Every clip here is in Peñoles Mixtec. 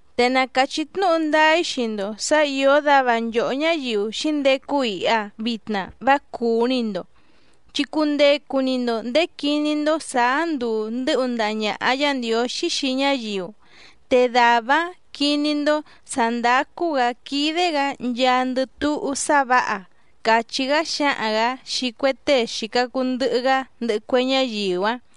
’Te na càchí tnúhu ndáá‑í xii‑ndo sǎ ìó dava nchòhó ñáyiu xǐndecu iha vitna vá cùú‑ni‑ndo, chi cundecu‑ni‑ndo ndèé quiní‑ndó sàá nduu ndɨ́hu ndaha ñàha Yá Ndiǒxí xii ñáyiu, te dàvá‑áⁿ quiní‑ndó sǎ ndácú‑gǎ quídé‑gǎ nchaandɨ túhú sá vǎha —càchí‑gá xǎhaⁿ‑gǎ xii cue tée xìca cuu ndɨhɨ‑gá ndɨhɨ cue ñáyiu‑áⁿ.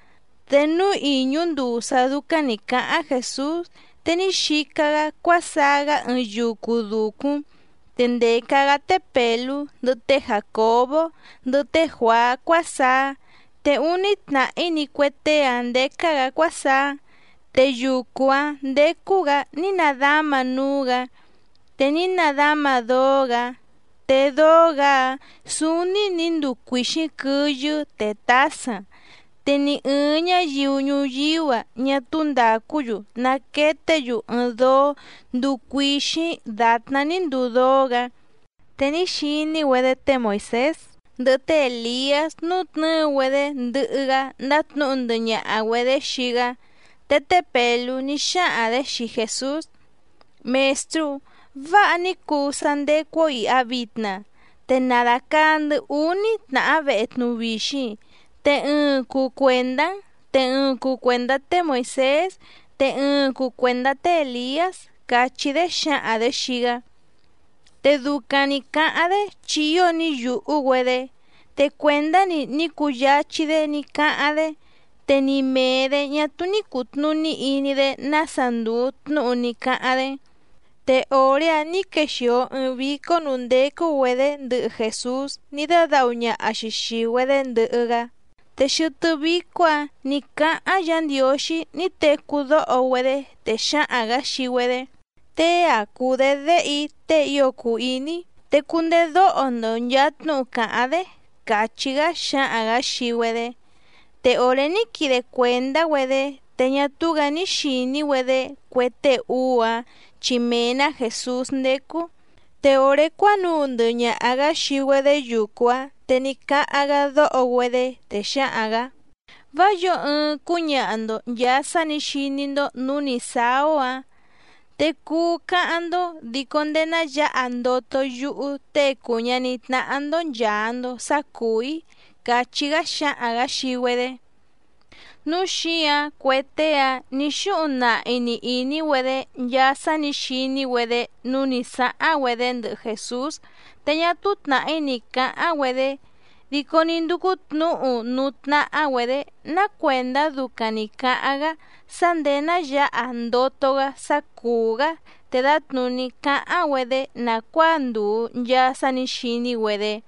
Te núú ìñú nduu sá dúcáⁿ nǐ cáháⁿ Jèsús te ní xica‑gá cuásaá‑gá ɨɨⁿ yucu dùcúⁿ, te ndèca‑gá té Pèlú, ndɨhɨ té Jàcobó, ndɨhɨ té Juàá cuásaá, te úní tnàhí‑ni cue tée‑áⁿ ndécá‑gǎ cuásaá. Te yucu‑áⁿ ndécú‑gǎ ní nadama núú‑gǎ, te ní nadama dóó‑gǎ. Te dóó‑gǎ‑áⁿ sǔúní nǐ nduu cuìxíⁿ quɨyɨ́ te tǎsaⁿ, te ni ɨ̀ɨⁿ ñáyiu ñuyíú‑a ñá túú ndàcú‑yu naqueté‑yu ɨɨⁿ dóó nduu cuìxíⁿ dàtná ní nduu dóó‑gǎ. Te ní xiní‑güedé té Moìsés ndɨhɨ té Èliás nútnɨ̌ɨ‑güedé ndɨhɨ‑gá ndátnǔhu ndɨhɨ ñaha‑güedě xii‑gá. Te té Pèlú ní xáhaⁿ‑dě xii Jèsús: —Mèstrú, ¡váha ní cuu sá ndécú‑ó ìha vitna! Te na dàcaa‑ndɨ́ úní tnàhá vehe tnuvixiⁿ, te ɨɨⁿ cuu cuèndá‑n te ɨɨⁿ cuu cuèndá té Moìsés te ɨɨⁿ cuu cuèndá té Èliás —càchí‑dé xǎhaⁿ‑dě xii‑gá. Te ducaⁿ nǐ cáháⁿ‑dé chi ío ní yùhú‑güedé, te cuèndá‑ni ní cuu yáchí‑dé ní cáháⁿ‑dé, te ni mèe‑dé ñá túú ní cùtnuní iní‑dé nása ndùu tnúhu ní cáháⁿ‑dé. Te òré‑áⁿ nǐ quexìo ɨɨⁿ vícó nǔú ndécú‑güedě ndɨhɨ Jèsús ní dádǎhu ñaha‑xi xìi‑güedé ndɨhɨ‑gá, te xɨtɨ́ vícó‑ǎⁿ nǐ cáháⁿ Yǎ Ndiǒxí ní tecú dóho‑güedé, te xǎhaⁿ‑gǎ xii‑güedé: —Tée‑a cùu‑dé Déhe‑í tée ío cùu iní‑í, te cundedóho‑ndo nchàa tnúhu càháⁿ‑dé —càchí‑gá xǎhaⁿ‑gǎ xii‑güedé. Te òré ní quide cuèndá‑güedé, te ñá túú‑gǎ ní xìní‑güedé cue tée úú‑áⁿ chi mee‑nǎ Jèsús ndécú. Te òré cuánuu ndɨhɨ ñaha‑gǎ xii‑güedé yucu‑áⁿ, te ní cáháⁿ‑gá dóho‑güedé, te xǎhaⁿ‑gǎ: —Vá yǒo ɨɨⁿ cúñaha‑ndo nchàa sá nǐ xiní‑ndó nǔú nǐ sáá‑ó‑á, te cuu cáháⁿ‑ndó dico ndéé ná yǎha ndoto yúhú Tée cùu ñaní tnáhá‑ndó nchàa‑ndo sá cùú‑í —càchí‑gá xǎhaⁿ‑gǎ xii‑güedé. Núu xíǎⁿ cue tée‑áⁿ nǐ xúhuⁿ nahi‑ni ìní‑güedé nchaa sá nǐ xiní‑güedé núú nǐ sáháⁿ‑güedé ndɨhɨ Jèsús te ñá túú tnàhí ni cǎháⁿ‑güedé, dico ní ndúcú tnǔhu núú tnáhá‑güedě ná cuèndá ducaⁿ nǐ cáháⁿ‑gá sá ndèé ná yǎha ndoto‑gá sá cùú‑gá te dǎtnùní cáháⁿ‑güedé nàcuáa ndùu nchaa sá nǐ xiní‑güedé.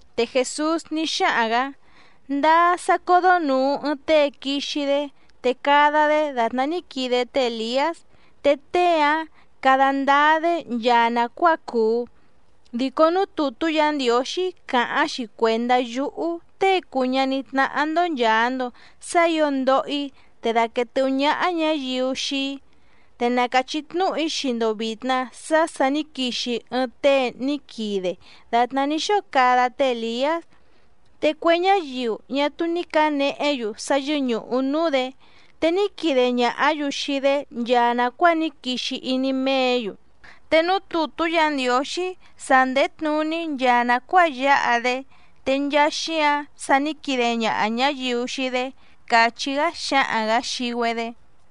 Te Jèsús ní xáhaⁿ‑gǎ: —Ndáá sá códó nùu ɨɨⁿ tée quixi‑dé te cada‑dé dàtná ní quide té Èliás, te tée‑áⁿ cada ndáá‑dé nchaa nàcuáa cùu. Dico núú tùtú Yǎ Ndiǒxí càháⁿ‑xi cuèndá yúhú Tée cùu ñaní tnáhá‑ndó nchàa‑ndo sá ǐo ndoho‑í, te daquèe tɨhú ñáhá ñǎyiu xii‑í. Te na càchí tnúhu‑í xii‑ndo vìtna sá sà ní quixi ɨɨⁿ tée ní quide dàtná ní xóo cada té Èliás, te cue ñáyiu ñá túú ní cǎnehé‑yu sá yɨ́ñùhu núú‑dě, te ní quide ñàhá‑yu xii‑dé nchaa nàcuáa ní quixi iní méě‑yu. Te núú tùtú Yǎ Ndiǒxí sa ndèé tnuní nchaa nàcuáa yáha‑dé, te nchaa xíǎⁿ sa ní quide ñaha ñáyiu xii‑dé —càchí‑gá xǎhaⁿ‑gǎ xii‑güedé.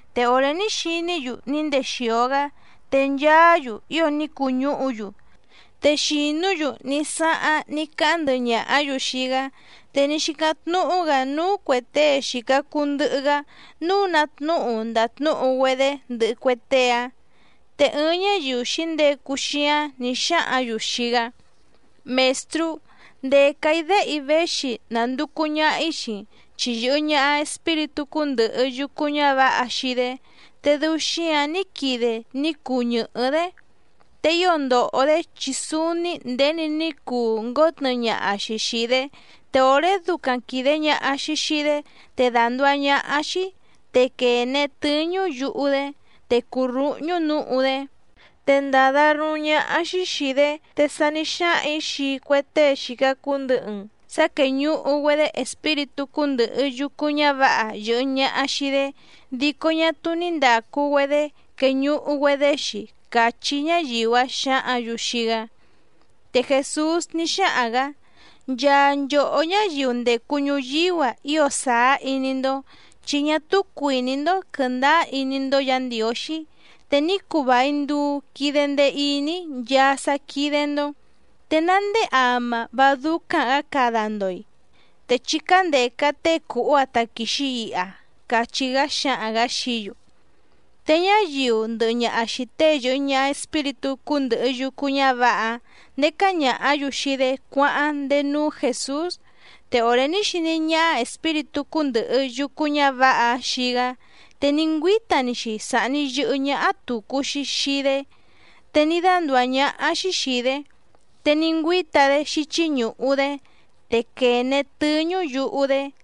Te òré ní xiní‑yu ní ndexìo‑gá, te nchaá‑yu ío ní cuñúhu‑yu, te xìnú‑yu ní sáháⁿ ní cáháⁿ ndɨhɨ ñàhá‑yu xii‑gá. Te ní xícáⁿ tnúhú‑gǎ núú cuè tée xìca cuu ndɨhɨ‑gá nǔu ná tnúhu ndàtnúhu‑güedé ndɨhɨ cue tée‑áⁿ. Te ɨɨⁿ ñáyiu xǐndecu xíáⁿ nǐ xáhǎⁿ‑yu xii‑gá: —Mèstrú, ndèca‑í déhe‑í véxi nànducu ñaha‑í xii‑n, chi yɨ̀hɨ ñaha espíritú cúndɨ̀hɨ yucu ñávǎha xii‑dé, te dɨu xíǎⁿ ní quide ní cuu ñɨ̀hɨ́‑dé. Te ío ndòho‑dé chi súúní nděni ní cuu ngǒtnɨɨ ñaha‑xi xìi‑dé, te òré ducaⁿ quìde ñaha‑xi xii‑dé te dànduá ñáhá‑xí, te quène tɨ́ñú yuhu‑dé, te cùrúhñú nǔhu‑dé, te ndàda ruúⁿ ñáhá‑xí xìi‑dé. Te sa ní xáhaⁿ‑ǐ xii cue tée xìca cuu ndɨhɨ‑n sá quéñùhu‑güedé espíritú cúndɨ̀hɨ yucu ñávǎha yɨ̀hɨ ñaha xii‑dé dico ñá túú ní ndàcu‑güedé queñuhu‑güedé‑xi —càchí ñáyiu‑áⁿ xǎhǎⁿ‑yu xii‑gá. Te Jèsús ní xáhaⁿ‑gǎ: —¡Nchaa nchòhó ñáyiu ndècu ñuyíú‑a ío sàá iní‑ndó, chi ñá túú cuìní‑ndó quɨ̀ndáá iní‑ndó Yǎ Ndiǒxí, te ní cuu vài nduu quide ndee iní‑í nchaa sá quídé‑ndó! ¿Te ná ndéé ama vá dúcáⁿ‑gǎ cada‑ndo‑i? Te chí cándèca tée cùhú‑áⁿ táquìxi iha —cachí‑gá xǎhaⁿ‑gǎ xií‑yu. Te ñáyiu ndɨhɨ ñaha xìi tée yɨ̀hɨ ñaha espíritú cúndɨ̀hɨ yucu ñávǎha‑áⁿ ndécá ñàhá‑yu xii‑dé cuáháⁿ ndéé núú Jèsús, te òré ní xiní ñáhá espíritú cúndɨ̀hɨ yucu ñávǎha‑áⁿ xii‑gá, te ní ngüíta‑ni‑xi sàhni yɨhɨ́ ñáhá tùcu‑xi xii‑dé, te ní dándùá ñáhá‑xí xìi‑dé, te ní ngüíta‑dé xíchí ñùhu‑dé, te quène tɨ́ñú yuhu‑dé.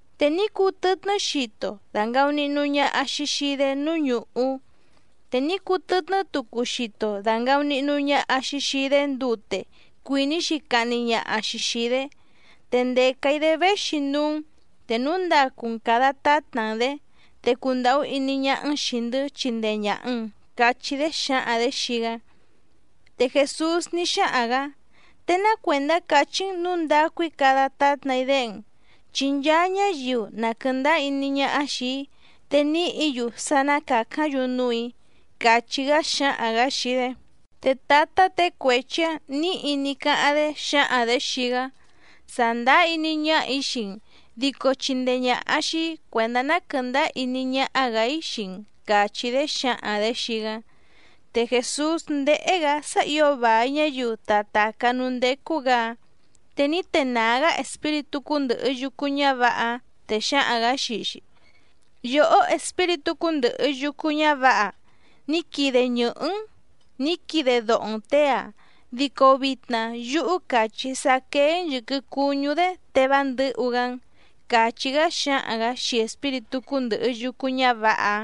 Te ní cùtɨtnɨ́ xito dàngaunihnu ñaha‑xi xii‑dé núú ñùhú, te ní cutɨtnɨ́ tucu xito dàngaunihnu ñaha‑xi xii‑dé ndute cuìní‑xi cahni ñaha‑xi xìi‑dé. Te ndèca‑í‑dé véxi núú‑n te núu ndacu‑n càda tátna‑n‑dě, te cundàhú iní ñáhá‑n xìi‑ndɨ́ chindee ñàha‑n —cachí‑dé xǎhaⁿ‑dě xii‑gá. Te Jèsús ní xáhaⁿ‑gǎ: —Te ná cuèndá càchí‑n nǔu ndacu‑í cada tátna‑í déhe‑n, chi nchaa ñáyiu na quɨ̀ndáá iní ñáhá xìi‑í te nìhí‑yu sá ná càcáⁿ‑yu núù‑í —càchí‑gá xǎhaⁿ‑gǎ xii‑dé. Te tǎtá těe cuechi‑ǎⁿ nǐhi ní cáháⁿ‑dé xǎhaⁿ‑dě xii‑gá: —Sàndáá iní ñáhà‑í xii‑n, dico chindee ñàha xii‑í cuèndá ná quɨ̀ndáá iní ñáhá‑gǎ‑í xii‑n —càchí‑dé xǎhaⁿ‑dě xii‑gá. Te Jèsús ndéhé‑gǎ sá ǐo vài ñáyiu ta tàcá núú ndécú‑gǎ‑áⁿ. Te ní tenàá‑gá espíritú cúndɨ̀hɨ yucu ñávǎha‑áⁿ, te xǎhaⁿ‑gǎ xii‑xi: —Yòhó espíritú cúndɨ̀hɨ yucu ñávǎha, ní quide ñɨ̀hɨ́‑n nǐ quide doho‑n těe‑a, dico vitna yúhú càchí‑í sá quéé‑n yɨ̀quɨ cuñú‑dé te vá ndɨ̌hu‑gá‑n —càchí‑gá xǎhaⁿ‑gǎ xii espíritú cúndɨ̀hɨ yucu ñávǎha‑áⁿ.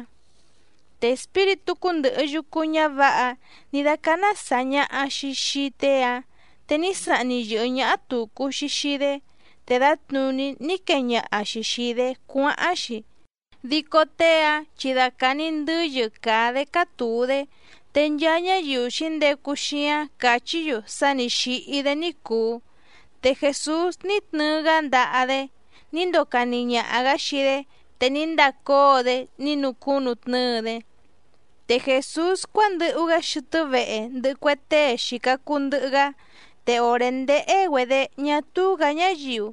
Te espíritú cúndɨ̀hɨ yucu ñávǎha‑áⁿ nǐ dácáná sàa ñaha‑xi xii tée‑áⁿ, te ní sahni yɨ̀hɨ́ ñáhá tùcu‑xi xii‑dé, te dǎtnùní ní quee ñaha‑xi xìi‑dé cuáháⁿ‑xi, dico tée‑áⁿ chi dacàa‑ni ndɨ́yɨ càa‑dé cátùu‑dé. Te nchaa ñáyiu xǐndecu xíáⁿ càchí‑yu sá nǐ xíhí‑dé ní cùu. Te Jèsús ní tnɨɨ‑gá ndaha‑dé ní ndocani ñaha‑gǎ xii‑dé, te ní ndacóo‑dé ní nucúnutnɨ́ɨ‑dé. Te Jèsús cuándɨhu‑gá xɨtɨ́ vehe ndɨhɨ cue tée xìca cuu ndɨhɨ‑gá, te òré ndéhé‑güedě ñá túú‑gǎ ñáyiu,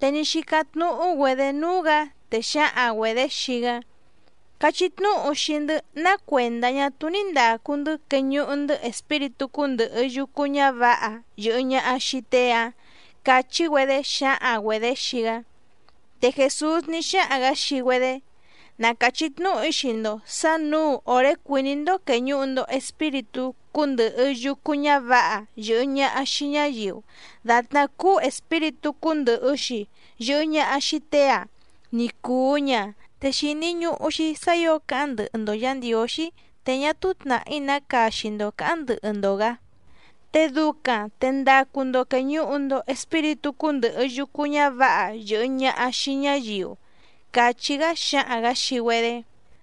te ní xícáⁿ tnúhú‑güedě núú‑gǎ, te xǎhaⁿ‑güedě xii‑gá: —Cachí tnúhu xii‑ndɨ́ ná cuèndá ñá túú ní ndàcu‑ndɨ́ queñuhu‑ndɨ́ espíritú cúndɨ̀hɨ yucu ñávǎha yɨ̀hɨ ñaha xii tée‑ǎⁿ —càchí‑güedé xǎhaⁿ‑güedě xii‑gá. Te Jèsús ní xáhaⁿ‑gǎ xii‑güedé: —Na càchí tnúhu‑í xii‑ndo sǎ nǔu òré cuìní‑ndó quèñuhu‑ndo espíritú cúndɨ̀hɨ yucu ñávǎha yɨ̀hɨ ñaha xii ñáyiu dàtná cúú espíritú cúndɨ̀hɨ‑xi yɨhɨ ñaha xii tée‑ǎⁿ ní cùu ña, te xìni ñuhu‑xi sá ǐo cáháⁿ ndɨhɨ‑ndo Yǎ Ndiǒxí te ñá túú tnàhí ná caxi‑ndo cǎháⁿ ndɨhɨ‑ndo‑gǎ, te ducaⁿ te ndacu‑ndo quèñuhu‑ndo espíritú cúndɨ̀hɨ yucu ñávǎha yɨ̀hɨ ñaha xii ñáyiu —càchí‑gá xǎhaⁿ‑gǎ xii‑güedé.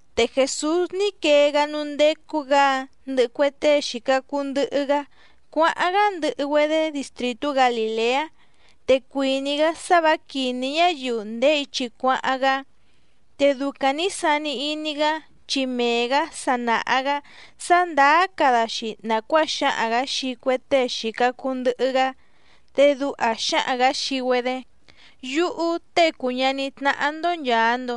Te Jèsús ní quee‑gá núú ndécú‑gǎ‑áⁿ ndɨhɨ cue tée xìca cuu ndɨhɨ‑gá cuáháⁿ‑gá ndɨhɨ‑güedé distrìtú Galìleá, te cuìní‑gá sá vǎ quìní ñáyiu ndèé ichi cuáháⁿ‑gá. Te ducaⁿ nǐ sani iní‑gá, chi mee‑gǎ sa nàha‑gá sá ndàá cada‑xi nàcuáa xǎhaⁿ‑gǎ xii cue tée xìca cuu ndɨhɨ‑gá, te duha xǎhaⁿ‑gǎ xii‑güedé: —Yúhú Tée cùu ñaní tnáhá‑ndó nchàa‑ndo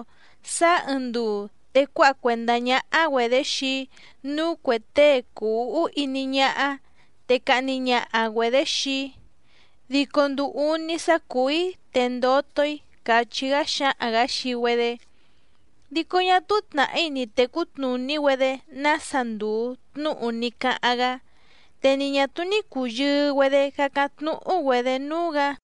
sáá ɨɨⁿ nduu te cuáha cuèndá ñáhá‑güedě xii‑í núú cuè tée cùu úhú iní ñáhá, te cahni ñaha‑güedě xii‑í, dico nduu úní sá cùú‑í te ndoto‑í —càchí‑gá xǎhaⁿ‑gǎ xii‑güedé. Dico ñá túú tnàhí ni tècú tnùní‑güedé nása ndùu tnúhu ní cáháⁿ‑gá, te ni ñà túú ní cùyɨɨ‑güedé cácáⁿ tnúhú‑güedě núú‑gǎ.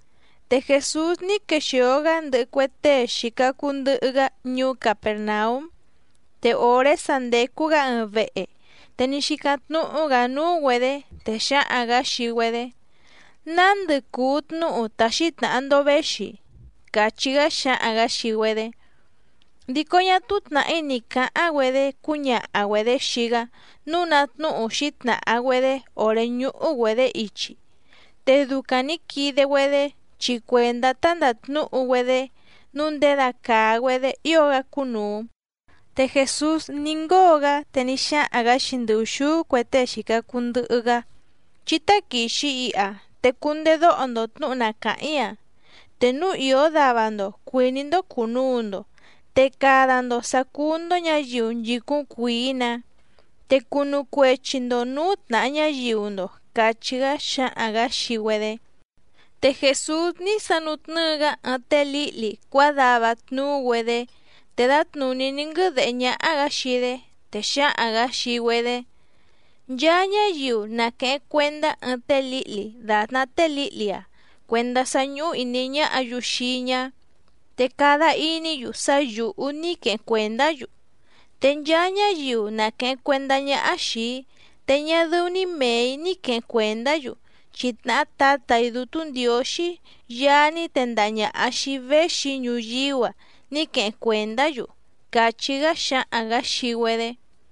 Te Jèsús ní quexìo‑gá ndɨhɨ cue tée xìca cuu ndɨhɨ‑gá ñuú Capèrnaúm, te òré sa ndècu‑gá ɨɨⁿ vehe te ní xícáⁿ tnúhú‑gǎ núú‑güedě, te xǎhaⁿ‑gǎ xii‑güedé: —¿Nándɨ cùu tnúhu ta xǐtnàha‑ndo véxi? —càchí‑gá xǎhaⁿ‑gǎ xii‑güedé. Dico ñá túú tnàhí ni cǎháⁿ‑güedé cúñaha‑güedě xii‑gá nǔu ná tnúhu xǐtnàha‑güedé òré ñúhú‑güedě ichi. Te ducaⁿ nǐ quide‑güedé chi cuèndá tá ndàtnúhu‑güedé nǔu ndědacàa‑güedé ío‑gá cúnùu. Te Jèsús ní ngóo‑gá, te ní xáhaⁿ‑gǎ xii ndɨ ùxúú cue tée xìca cuu ndɨhɨ‑gá: —Chí táquìxi iha te cundedóho‑ndo tnǔhu na càháⁿ‑í‑a. Te núu ìó dava‑ndo cuìní‑ndó cùnuu‑ndo, te cada‑ndo sǎ cúú‑ndó ñǎyiu nchìcúⁿ cuìí‑nǎ, te cunu cuechi‑ndo nǔú tnàha ñáyiu‑ndo —càchí‑gá xǎhaⁿ‑gǎ xii‑güedé. Te Jèsús ní sanutnɨ́ɨ‑gá ɨɨⁿ té lǐhli cuádava tnuú‑güedé, te dǎtnùní ní nguɨ́dèhé ñáhá‑gǎ xii‑dé, te xǎhaⁿ‑gǎ xii‑güedé: —Nchaa ñáyiu na quèheⁿ cuendá ɨɨⁿ té lǐhli dàtná té lǐhli‑a cuèndá sá ñúhú ìní ñáhǎ‑yu xii‑í ñá, te cada iní‑yu sá yǔhú ní queheⁿ cuèndá‑yu. Te nchaa ñáyiu na quèheⁿ cuendá ñáhá xìi‑í te ñá dɨ́ú‑ní mèe‑í ní quèheⁿ cuendá‑yu, chi tnàhá Tǎtà‑í Dútú Ndiǒxí Yaá ní tendaha ñàha xii‑í véxi‑í ñuyíú‑a ní queheⁿ cuèndá‑yu —càchí‑gá xǎhaⁿ‑gǎ xii‑güedé.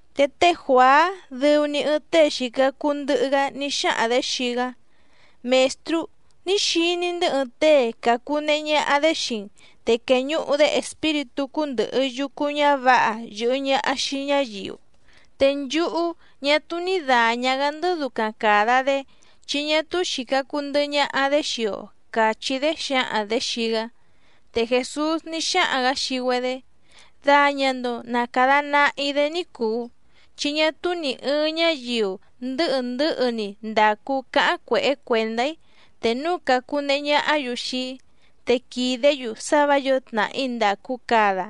Te té Juàá dɨu‑ni ɨɨⁿ tée xìca cuu ndɨhɨ‑gá ní xáhaⁿ‑dě xii‑gá: —Mèstrú, ní xiní‑ndɨ́ ɨɨⁿ tée càcunehe ñaha‑dé xii‑n, te quèñuhu‑dé espíritú cúndɨ̀hɨ yucu ñávǎha yɨ̀hɨ ñaha xii ñáyiu, te nchúhú ñá túú ní dàña‑gá‑ndɨ́ ducaⁿ càda‑dé, chi ñá túú xìca cuu ndɨhɨ ñaha‑dé xii‑o —càchí‑dé xǎhaⁿ‑dě xii‑gá. Te Jèsús ní xáhaⁿ‑gǎ xii‑güedé: —Daña‑ndo na càda nahi‑dé ní cùu, chi ñá túú nì ɨɨⁿ ñáyiu ndɨ̌hɨ ndɨ̌hɨ‑ni ndacu cáháⁿ cuèhé cuèndá‑í te núu càcunehe ñahá‑yu xii‑í, te quìdé‑yu sá vǎ yǒo tnàhí ndàcu cada.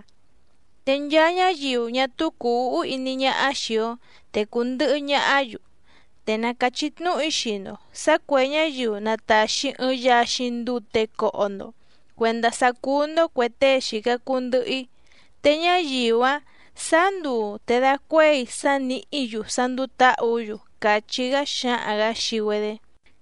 Te nchaa ñáyiu ñá túú cùu úhú iní ñáhá xìi‑o te cùndɨhɨ ñahá‑yu. Te na càchí tnúhu‑í xii‑ndo sǎ cuè ñáyiu na tàxi ɨɨⁿ yaxiⁿ ndute coho‑ndo cuendá sá cúú‑ndó cuè tée xìca cuu ndɨhɨ‑í, te ñáyiu‑áⁿ sǎá nduu te dacuéi sá nìhí‑yu sá ndúú tǎhǔ‑yu —càchí‑gá xǎhaⁿ‑gǎ xii‑güedé.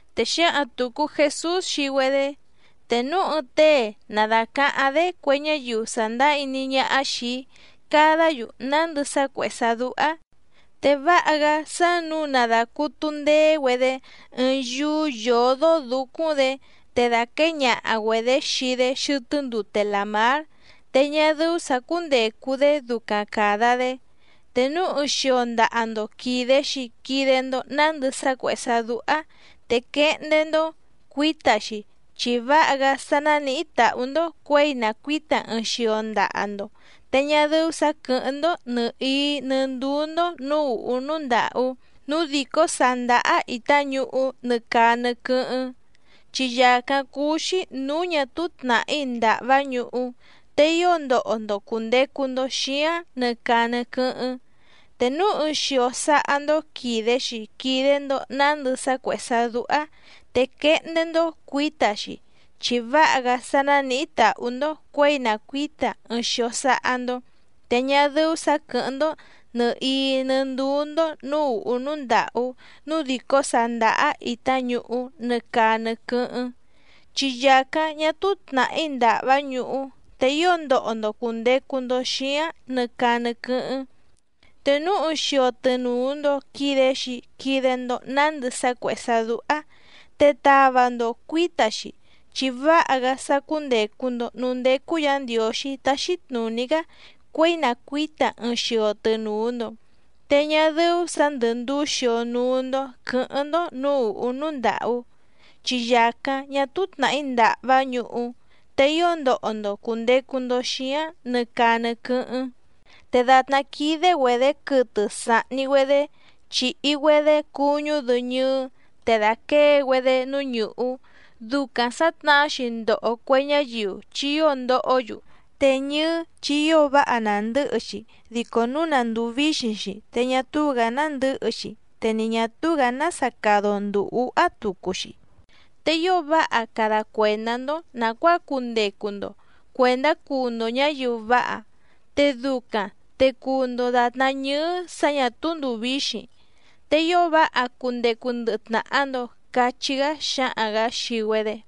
Te xǎhaⁿ tùcu Jesús xii‑güedé: —Te núu ɨɨⁿ tée na dàcaháⁿ‑dé cue ñáyiu sàndáá iní ñáhá xìi‑í cadá‑yu nándɨ sá cuèhé sá dúhá, te váha‑gá sá nǔu na dàcutu ndeé‑güedé ɨɨⁿ yúú yǒdó dǔcúⁿ‑dě, te dàquée ñaha‑güedě xii‑dé xɨtɨ́ ndute làmár, te ñá dɨ́ú sǎ cúndècu‑dé ducaⁿ càda‑dé. Te núu ɨɨⁿ xio ndaha‑ndo quìde‑xi quide‑ndo nándɨ sá cuèhé sá dúhá, te quehndé‑ndó cuǐta‑xi, chi váha‑gá sá nánìhí tàhú‑ndó cuěi na cuǐta ɨɨⁿ xio ndaha‑ndo te ñá dɨ́ú sǎ quɨ̀hɨ́ⁿ‑ndó nɨ̀hií nɨ́ ndúú‑ndó nǔú ùhú núú ndàhú núú dìcó sàá ndáhá ìtá ñuhú nɨ caa nɨ quɨ́hɨ́ⁿ. Chi yàcáⁿ cúú‑xí nǔú ñà túú tnàhí ndàhvá ñuhú, te ío ndoho‑ndo cùndecu‑ndo xíáⁿ nɨ caa nɨ quɨ́hɨ́ⁿ. Te núu ɨɨⁿ xio sáhá‑ndó quìde‑xi quide‑ndo nándɨ sá cuèhé sá dúhá, te quehndé‑ndó cuǐta‑xi, chi váha‑gá sá nánìhí tàhú‑ndó cuěi na cuǐta ɨɨⁿ xio sáhá‑ndó, te ñá dɨ́ú sǎ quɨ̀hɨ́ⁿ‑ndó nɨ̀hií nɨ́ ndúú‑ndó nǔú ùhú núú ndàhú núú dìcó sàá ndáhá ìtá ñuhú nɨ caa nɨ quɨ́hɨ́ⁿ. Chi yàcáⁿ ñá túú tnàhí ndàhvá ñuhú, te ío ndoho‑ndo cùndecu‑ndo xíáⁿ nɨ caa nɨ quɨ́hɨ́ⁿ. Te núu ɨɨⁿ xio tɨnùu‑ndo quide‑xi quide‑ndo nándɨ sá cuèhé sá dúhá, te tava‑ndo cuǐta‑xi, chi váha‑gá sá cúndècu‑ndo núú ndécú Yǎ Ndiǒxí táxí tnùní‑gá cuěi na cuǐta ɨɨⁿ xio tɨnùu‑ndo, te ñá dɨ́ú sǎ ndɨ̀ nduú xio núú‑ndó quɨ̌hɨ́ⁿ‑ndó nǔú ùhú núú ndàhú. Chi yàcáⁿ ñá túú tnàhí ndàhvá ñuhú, te ío ndoho‑ndo cùndecu‑ndo xíáⁿ nɨ caa nɨ quɨ́hɨ́ⁿ. ’Te dàtná quídé‑güedě quɨtɨ sàhni‑güedé chìhi‑güedé cuñú‑dɨ ñɨɨ́ te dàquée‑güedé núú ñùhú, ducaⁿ sǎtnahá‑xi ndoho cue ñáyiu chi ío ndohó‑yu. Te ñɨ́ɨ́ chi ío váha nàndɨ́hɨ‑xi, dico núu na ndùu víxiⁿ‑xi te ñá túú‑gǎ nándɨ̌hɨ‑xi te ni ñà túú‑gǎ nása cada‑o ndùu úhá tucu‑xi. Te ío váha cada cuèndá‑ndó nàcuáa cundecu‑ndo cuèndá cuu‑ndo ñǎyiu váha, te ducaⁿ te cuu‑ndo dàtná ñɨ́ɨ́ sǎ ñà túú ndùu víxiⁿ, te ío váha cundecu ndɨhɨ tnàha‑ndo —cachí‑gá xǎhaⁿ‑gǎ xii‑güedé.